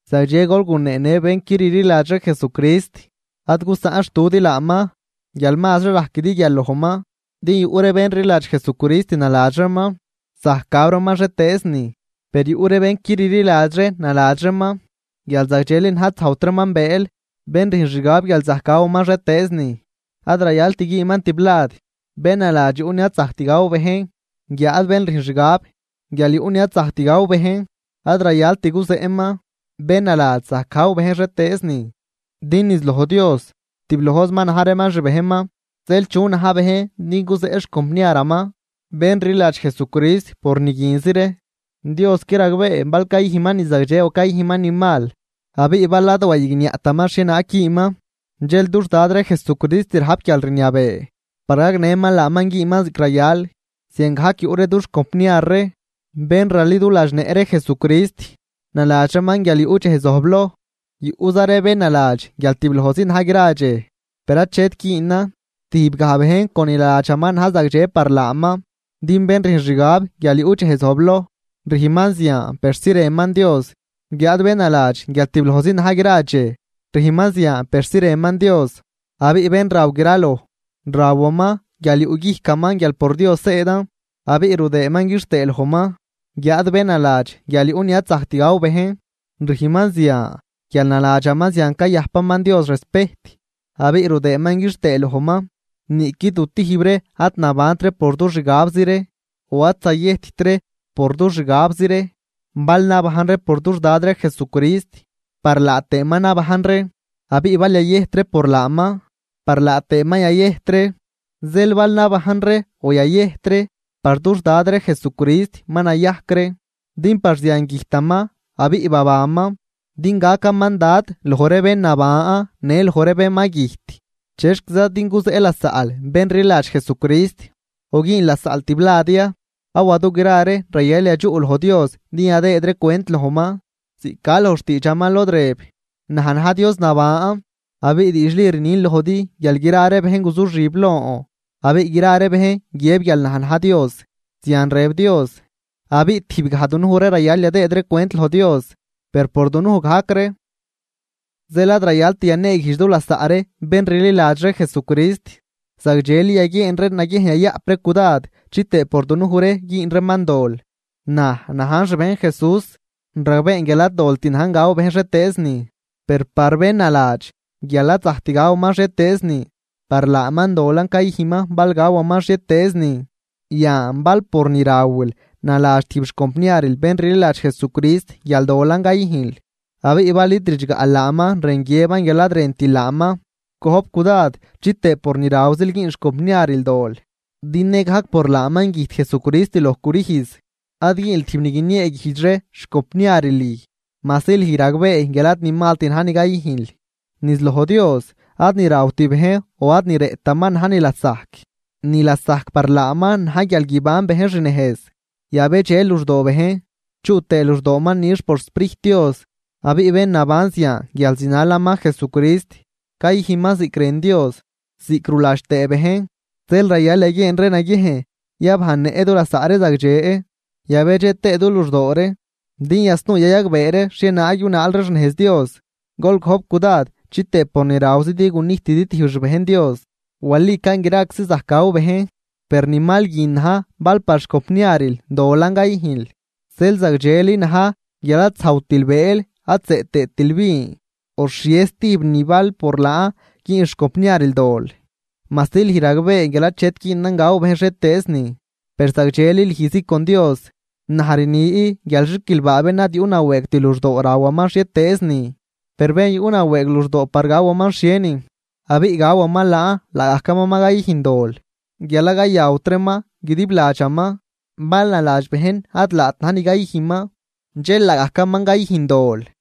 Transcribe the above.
Zagdxe gol guneenë bén qui rliladxri Jesucrist ad gusaꞌnxtudi laaman guial mazri rajquidi guial lojman. Din yuꞌ ree bén rliladx Jesucrist naladx reeman zajc gaw reeman xhietëëz nin, per yuꞌ ree bén qui rliladxri naladx reeman guial zagdxeli na̱j ad zajwt reeman bëël. Bén rüjn xgab guial zajc gawaman xhietëëz nin, ad rayalt güünman tiblad bén naladx yuꞌ ni ad zajct gaw bejn. Guiáad bén rüjn xgab guial yuꞌ ni ad zajct gaw bejn, ad rayalt guzeꞌman bén naladx zajc gaw bejn xhietëëz nin. Din niz loj Dios tiblojzi ma na̱j reeman xbejnman. Zeel, ¿chu na̱j bejn din guzeꞌ xcompniaraman bén rliladx Jesucrist por niguinzi ree? Diosqui ragbee bal cayüjnman ni zagdxe o cayüjnman ni mal. Abiꞌ bal ad wayigniaꞌtaman xhienaag güünman, dxel dux Dad ree Jesucrist rajp guialrniabee par gagnëman laaman güünman ziꞌc rayal. Ziangajc yuꞌ ree dux compniar ree bén raliduladxnëꞌ ree Jesucrist naladx reeman guial yuꞌ dxej zojbloj, yuꞌza ree bén naladx guial tiblojzi na̱j gra dxej, per achet güünan, tijbgaj bejn con ni naladxaman na̱j zagdxe par laaman. Din bén rüjn xgab guial yuꞌ dxej zojbloj, rüjnman zian persi rënman Dios. Guiáad bén naladx guial tiblojzi na̱j gra dxej, rüjnman zian persi rënman Dios. Abiꞌ bén raw graloj, rawaman guial yuꞌguijcaman guial por Dios zëëdan abiꞌ rudëëman quixtëë lojman. Guiáad bén naladx guial yuꞌ ni ad zajct gaw bejn, rüjnman zian guial naladxaman zian cayajpaman Dios respejt abiꞌ rudëëman quixtëë lojman. Niꞌqui du tijb ree ad nabant ree por dux xgabzi ree, o ad zayëjtt ree por dux xgabzi ree. Bal nabajn ree por dux Dad ree Jesucrist par laa tëëman nabajn ree. Abiꞌ bal yayëjt ree por laaman par laa tëëman yayëjt ree. Zeel bal nabajn ree o yayëjt ree, par dux Dad ree Jesucrist ma nayajc ree. Din par zian güjtaman abiꞌ babanman, din gacaman Dad loj ree bén naban në loj ree bén ma güjt. ¿Chexquiza din guzeꞌ lasaꞌl bén rliladx Jesucrist o güün lasaꞌl tiblad ya? Awa dugra ree rayal yadxuꞌ loj Dios din yadëëd ree cwent lojman. Ziꞌc ca loj xtiidxaman lod rëb: Naj na̱j Dios naban, abiꞌ diidxli rnin lojdi guial gra ree bejn guzuxib lon. Abiꞌ gra ree bejn guiëb guial naj na̱j Dios. Abiꞌ tijbgaj dunuj ree rayal yadëëd ree cwent loj Dios, per por dunuj gajc ree. Zeel ad rayalt yaneeguijdx du lasaꞌ ree bén rliladx ree Jesucrist, zagdxeli yaguieen ree naguiejn yayaꞌp ree cudad chitëë por dunuj ree güün reeman dol. Naj najn xbejn Jesús, ragbeen guial ad dolt na̱j gaw bejn xhietëëznin. Per par bén naladx guial ad zajct gawaman xhietëëznin, par laaman dolan cayüjnman bal gawaman xhietëëznin. Yan bal por ni rawil naladx tijb xcompniaril bén rliladx Jesucrist guial dolan cayüjnl, abiꞌ bal id ridxgaꞌl laaman rën guiëban guial ad rëntil laaman. Gojp cudad chitëë por ni rawzil güün xcompniaril dol, din nëgajc por laaman güjt Jesucrist loj crüjz. Ad güünl tijb ni guinieeguijdx ree xcompniaril lüj, majsi lüj ragbee guial ad ni malt na̱j ni cayüjnl. Niz loj Dios ad ni rawt bejn o ad ni rëꞌtaman na̱j ni lasajc, ni lasajc par laaman na̱j guial guiban bejn xnejz, yabedxe luxdoo bejn, chuꞌ tëë luxdooman nix por xSprijt Dios. Abiꞌ bén naban zian guial zinalaman Jesucrist, cayüjnman ziꞌc rën Dios, ziꞌc ruladx tëë bejn. Zeel rayal yaguieen ree naguiejn yabajnnëꞌ du lasaꞌ ree zagdxe yabedxe tëë du luxdoo ree, din yasnuu yayagbee ree xhienaag yunaal ree xnejz Dios. Gol gojp cudad chitëë por ni rawzidi gunijtidi tijb xbejn Dios. Walican graczi zajc gaw bejn. Per ni mal guin na̱j bal par xcompniaril dolan cayüjnl. Zeel zagdxeli na̱j guial ad zajwtil bëël ad zëꞌ tëëtil vin o xhie stijb nin bal por laan güün xcompniaril dol. Majsi lüj ragbee guial achet güünan gaw bejn xhietëëznin, per zagdxeli lüjzi con Dios. Naj rni guial, ¡xiquilbaa bén ad yuꞌnawëëgt luxdoo rawaman xhietëëznin! Per bén yuꞌnawëëg luxdoo par gawaman xhienin, abiꞌ gawaman laan laagajcaman ma cayüjn dol guial ad cayawtraman guidib ladxaman. Bal naladx bejn ad laat na̱j ni cayüjnman, dxel laagajcaman cayüjn dol.